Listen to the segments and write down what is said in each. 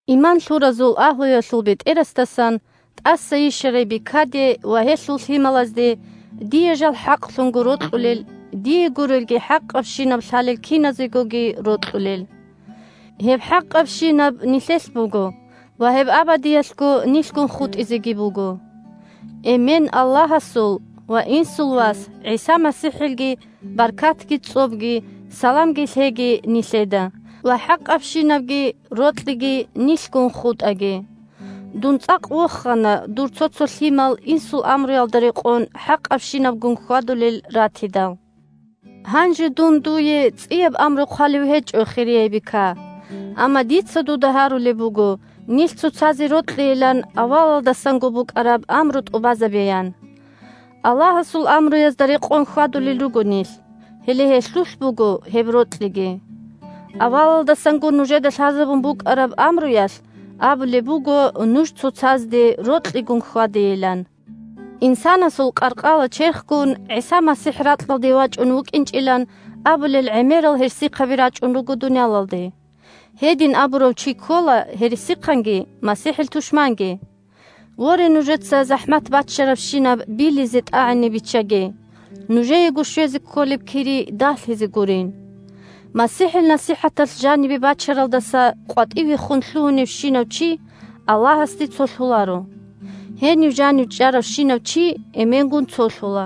Иман лъуразул агьлуялъул бетӀерасдасан – тӀаса йищарай бикаде ва гьелъул лъималазде, дие жал хӀакълъунго рокьулел, дие гурелги, хӀакъабщинаб лъалел киназегоги рокьулел. Гьеб хӀакъабщинаб нилъелъ буго ва гьеб абадиялъго нилъгун хутӀизеги буго. Эмен – Аллагьасул ва Инсул Вас ГӀиса МасихӀилги баркатги, цӀобги, саламги лъеги нилъеда ва хӀакъабщинабги рокьиги нилъгун хутӀаги. Дун цӀакъ вохана дур цо-цо лъимал Инсул амруялда рекъон хӀакъабщинабгун хьвадулел ратидал. Гьанже дун дуе цӀияб амру хъвалев гьечӀо, хирияй бика. Амма дица дуда гьарулеб буго нилъ цоцазе рокьейилан авалалдасанго букӀараб амру тӀубазабеян. Аллагьасул амруязда рекъон хьвадулел руго нилъ – гьеле гьелъулъ буго гьеб рокьиги. Авалалдасанго нужеда лъазабун букӀараб амруялъ абулеб буго нуж цоцазде рокьигун хьвадейилан. Инсанасул къаркъала-черхгун ГӀиса МасихӀ ракьалде вачӀун вукӀинчӀилан абулел гӀемерал гьерсихъаби рачӀун руго дуниялалде. Гьедин абурав чи ккола гьерсихъанги МасихӀил тушманги. Воре, нужеца захӀмат баччарабщинаб билизе-тӀагӀине биччаге, нужеего щвезе кколеб кири дагьлъизе гурин. МасихӀил насихӀаталъ жанибе бачаралдаса къватӀивехун лъугьуневщинав чи Аллагьасде цолъуларо. Гьенив жанив чӀаравщинав чи Эменгун цолъула,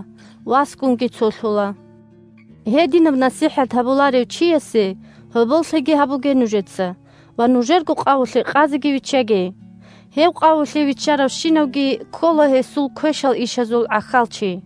Васгунги цолъула. Гьединаб насихӀат гьабуларев чиясе гьоболлъиги гьабуге нужеца ва нужерго къавулъе къазеги виччаге. Гьев къавулъе виччаравщинавги ккола гьесул квешал ишазул гӀахьалчи.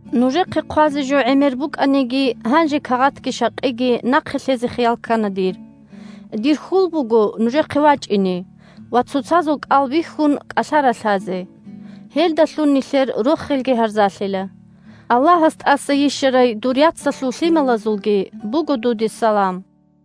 Нужехъе хъвазе жо гӀемер букӀаниги, гьанже кагъатги щакъиги нахъе лъезе хиял ккана дир. Дир хьул буго нужехъе вачӀине ва, цоцазул кӀал бихьун, кӀалъа-ралъазе. Гьелдалъун нилъер рохелги гьарзалъила. Аллагьас тӀаса йищарай дур яцалъул лъималазулги буго дуде салам.